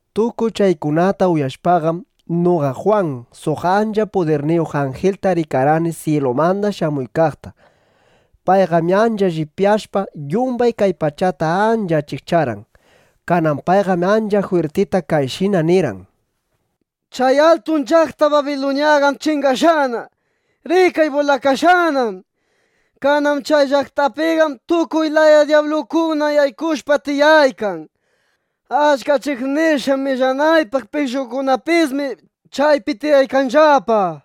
Tukuy chaykunata uyashpaqam, noqa Jwan suq ancha pudirniyuq anjilta rikarqani syilumanda shamuykaqta. Payqam ancha llipyashpa, yumbay kay pachata ancha achikcharqan. Kanan payqam ancha jwirtita kayshina nirqan: —¡Chay atun llaqta Babiluñaqam chingashqana! ¡Rikay, bulakashqanám! Kanan chay llaqtapiqam tukuy laya dyablukuna yaykushpa tiyaykan. Achka ch'iqnishqa millanaypaq pishqokunapismi chaypi tiyaykanllapa.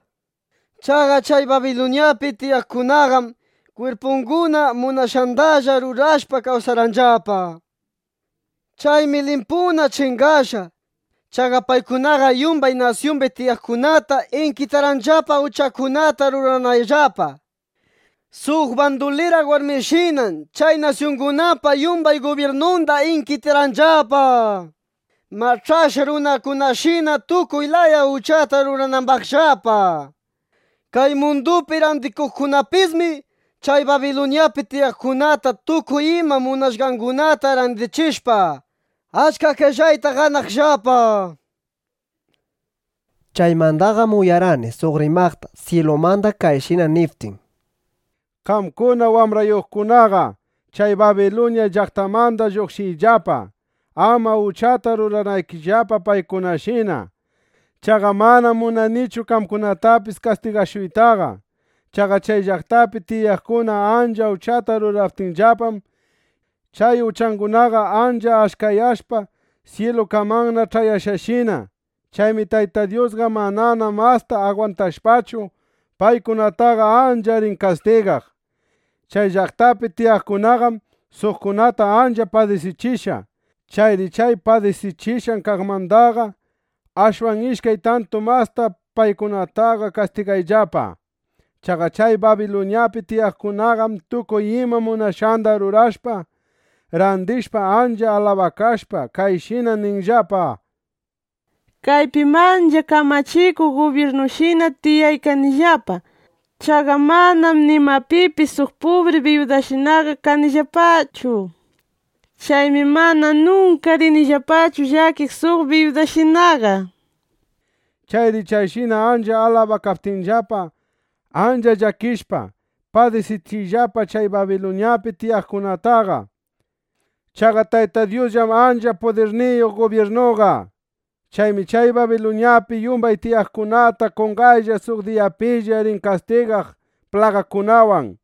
Chaqa chay Babiluñapi tiyaqkunaqam kwirpunguna munashqandalla rurashpa kawsarqanllapa. Chaymi limpuna chingashqa. Chaqa paykunaqam yumbay nasyumbi tiyaqkunata inkitarqanllapa, uchakunata rurananllapa. Suq bandulira warmishinam chay nasyungunapa yumbay gubyirnunda inkitarqanllapa, mach'ashqa runakunashina tukuy laya uchata ruranambaqllapa. Kay mundupi randikuqkunapismi chay Babiluñapi tiyaqkunata tukuy ima munashqangunata randichishpa, achka qellayta ganaqllapa. Chaymandaqam uyarqani suq rimaqta, syilumanda kayshina niptin: —Qamkuna wambraykunaqa, chay Babiluña llaqtamanda lluqshiyllapa, ama uchata ruranaykillapa paykunashina. Chaqa manam munanichu qamkunatapis kastigashuytaqa. Chaqa chay llaqtapi tiyaqkuna ancha uchata ruraptinllapam, chay uchangunaqa ancha achkayashpa syilukamanna ch'ayashqashina. Chaymi Tayta Dyusqa manana masta agwantashpachu, paykunataqa ancha rin kastigaq. Chay llaqtapi tiyaqkunaqam suqkunata ancha padisichishqa. Chayri chay padisichishqan kaqmandaqa ashwan ishkay tantu masta paykunataqa kastigayllapa. Chaqa chay Babiluñapi tiyaqkunaqam tukuy ima munashqanda rurashpa, randishpa, ancha alabakashpa, kayshina ninllapa: “Kaypim ancha kamachikuq gubyirnushina tiyaykanillapa. Chaqa manam nimapipis suq pubri biyudashinaqa kanillapachu. Chaymi mana nunka rinillapachu llakiq suq biyudashinaqa”, nishpa. Chayri chayshina ancha alabakaptinllapa, ancha llakichishpa, padisichiyllapa chay Babiluñapi tiyaqkunataqa. Chaqa Tayta Dyusllam ancha pudirniyuq gubyirnuqa. Chaymi chay Babiluñapi yumbay tiyaqkunata qonqaylla suq diyapilla rin kastigaq plagakunawan,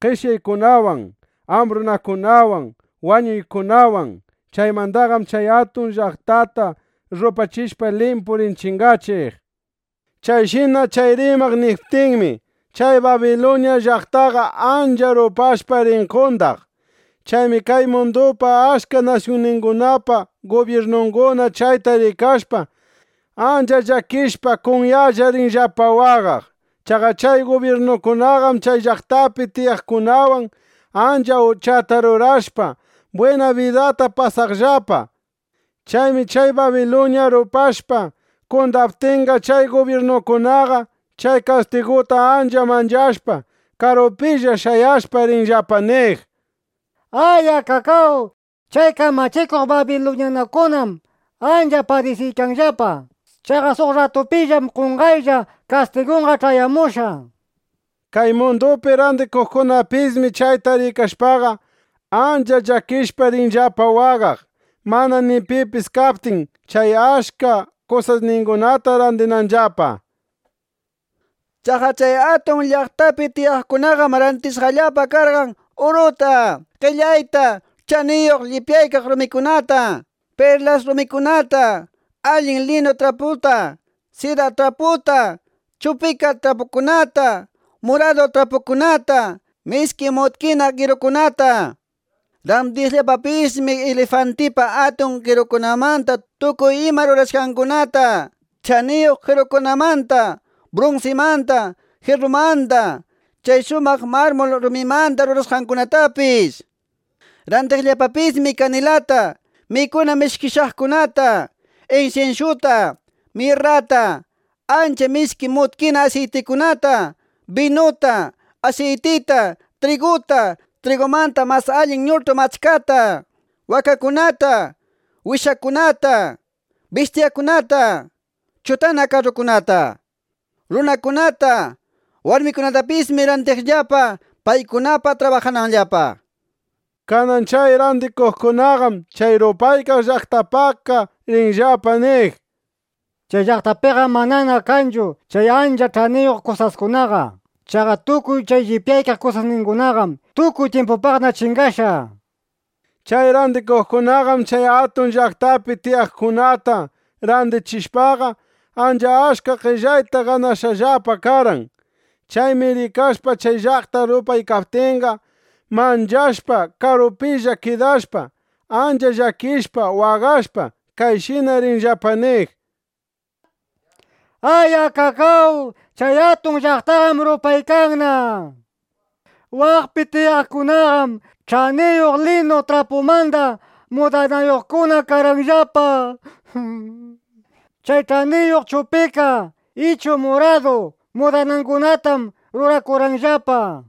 qeshyaykunawan, ambrunakunawan, wañuykunawan. Chaymandaqam chay atun llaqtata rupachishpa, limpu rin chingachiq. Chayshina chay rimaq niptinmi, chay Babiluña llaqtaqa ancha rupashpa rin qondaq. Chaymi kay mundupa achka nasyunningunapa gubyirnunguna chayta rikashpa, ancha llakishpa, kunyalla rinllapa waqaq. Chaqa chay gubyirnukunaqam chay llaqtapi tiyaqkunawan ancha uchata rurashpa, bwina bidata pasashqallapa karqan. Chaymi chay Babiluña rupashpa, qondaptinqa, chay gubyirnukunaqa chay kastiguta ancha manchashpa, karupilla shayashpa, rinllapa niq: —¡Ay! ¡Akakáw! Chay kamachikuq babiluñanukunam ancha padisiykanllapa. Chaqa suq rratupillam qonqaylla kastigunqa ch'ayamushqa, nishpa. Kay mundupi randikuqkunapismi chayta rikashpaqa, ancha llakishpa rinllapa waqaq, manana ni pipis kaptin chay achka kusasningunata randinanllapa. Chaqa chay atun llaqtapi tiyaqkunaqam randishqallapa karqan uruta, qellayta, ch'aniyuq llipyaykaq rumikunata, perlas rumikunata, allin linu traputa, sida traputa, chupika trapukunata, muradu trapukunata, mishki mutkina qerukunata. Randiqllapapismi ilifantipa atun kirungunamanda tukuy ima rurashqangunata, ch'aniyuq qerukunamanda, brunsimanda, jirrumanda, chay shumaq marmul rumimanda rurashqangunatapis. Randiqllapapismi kanilata, mikuna mishkichaqkunata, insinsyuta, mirrata, ancha mishki mutkina asiytikunata, binuta, asiytita, triguta, trigumanda mas allin ñutu mach'kata, wakakunata, wishakunata, bistyakunata, chutana karrukunata. Runakunata, warmikunatapismi randiqllapa, paykunapaq trabajananllapa. Kanan chay randikuqkunaqam chay rupaykaq llaqtapaqqa rinllapa niq: —Chay llaqtapiqam manana kanchu chay ancha ch'aniyuq kusaskunaqa. Chaqa tukuy chay llipyaykaq kusasningunaqam tukuy tyimpupaqna chingashqa, nishpa. Chay randikuqkunaqam chay atun llaqtapi tiyaqkunata randichishpaqa, ancha achka qellayta ganashqallapa karqan. Chaymi rikashpa chay llaqta rupaykaptinqa, manchashpa, karupilla kidashpa, ancha llakishpa, waqashpa kayshina rinllapa niq: —¡Ay! ¡Akakáw! Chay atun llaqtaqam rupaykanna. Waqpi tiyaqkunaqam ch'aniyuq linu trapumanda mudanayuqkuna karqanllapa. Chay ch'aniyuq chupika ichu muradu mudanangunatam rurakurqanllapa.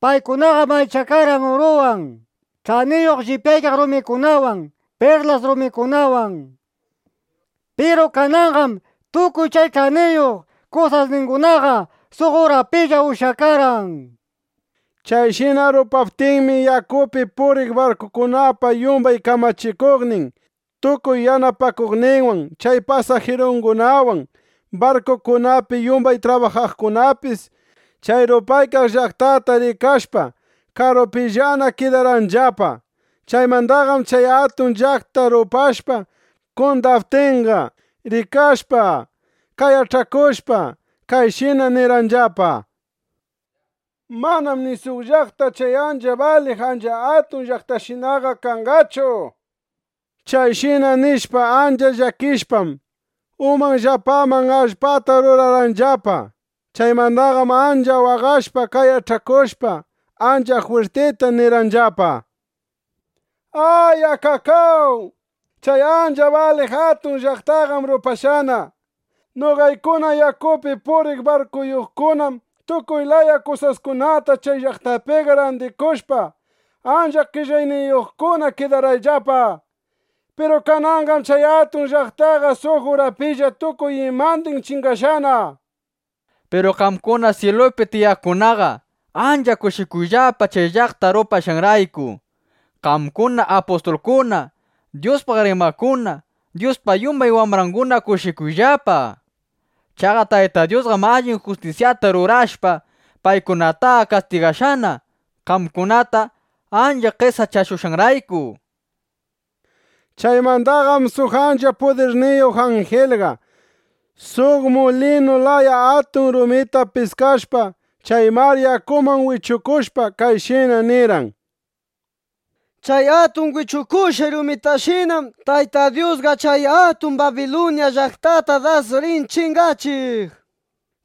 Paykunaqam allichakarqan uruwan, ch'aniyuq llipyaykaq rumikunawan, perlas rumikunawan. ¡Piru kananqam tukuy chay ch'aniyuq kusasningunaqa suq urapilla ushyakarqan! nishpa. Chayshina rupaptinmi, yakupi puriq barkukunapa yumbay kamachikuqnin, tukuy yanapakuqninwan, chay pasajirungunawan, barkukunapi yumbay trabajaqkunapis chay rupaykaq llaqtata rikashpa, karupillana kidarqanllapa. Chaymandaqam chay atun llaqta rupashpa qondaptinqa, rikashpa, qayach'akushpa, kayshina nirqanllapa: —Manam ni suq llaqta chay ancha baliq ancha atun llaqtashinaqa kashqachu. Chayshina nishpa, ancha llakishpam, umanllapaman allpata rurarqanllapa. Chaymandaqam ancha waqashpa, qayach'akushpa, ancha jwirtita nirqanllapa: —¡Ay! ¡Akakáw! Chay ancha baliq atun llaqtaqam rupashqana. Noqaykuna yakupi puriq barkuyuqkunam tukuy laya kusaskunata chay llaqtapiqa randikushpa, ancha qellayniyuqkuna kidarqayllapa. ¡Piru kananqam chay atun llaqtaqa suq urapilla tukuy imandin chingashqana! nishpa. Piru qamkuna syilupi tiyaqkunaqa ancha kushikuyllapa chay llaqta rupashqanrayku. Qamkuna apustulkuna, Dyuspaq rimaqkuna, Dyuspa yumbay wambranguna kushikuyllapa. Chaqa Tayta Dyusqam allin justisyata rurashpa, paykunataqa kastigashqana, qamkunata ancha qesachashushqanrayku. Chaymandaqam suq ancha pudirniyuq anjilqa suq mulinu laya atun rumita piskashpa, chay mar yakuman wichukushpa, kayshina nirqan: —Chay atun wichukushqay rumitashinam Tayta Dyusqa chay atun Babiluña llaqtata das rin chingachiq.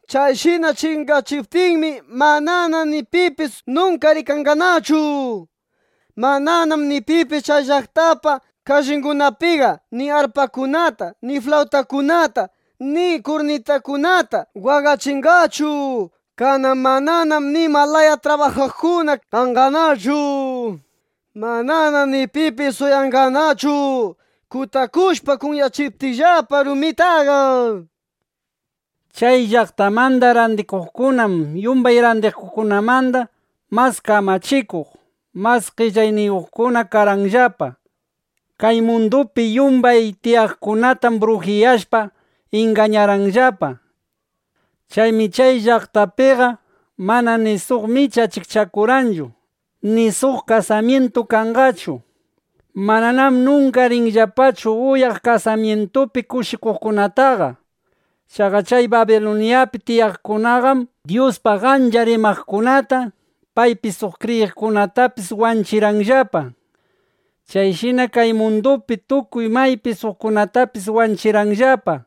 Chayshina chingachiptinmi, manana ni pipis nunka rikanqanachu. Mananam ni pipis chay llaqtapa kallingunapiqa ni arpakunata ni flawtakunata ni kurnitakunata waqachinqachu. Kanan mananam nima laya trabajaqkuna kanqanachu. Manana ni pipis uyanqanachu kutakushpa kunyachiptinllapa rumitaqa. Chay llaqtamanda randikuqkunam yumbay randikuqkunamanda mas kamachikuq, mas qellayniyuqkuna karqanllapa. Kay mundupi yumbay tiyaqkunatam brujiyashpa, ingañarqanllapa. Chaymi chay llaqtapiqam manana ni suq micha achikchakunqachu ni suq kasamyintu kanqachu. Mananam nunka rinllapachu uyaq kasamyintupi kushikuqkunataqa. Chaqa chay Babiluñapi tiyaqkunaqam Dyuspaq achka rimaqkunata, paypi suq kriyiqkunatapis wanchirqanllapa. Chayshinam kay mundupi tukuy maypi suqkunatapis wanchirqanllapa.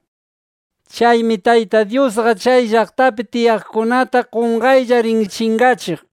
(Chaymi Tayta Dyusqa chay llaqtapi tiyaqkunata qonqaylla rin chingachiq.)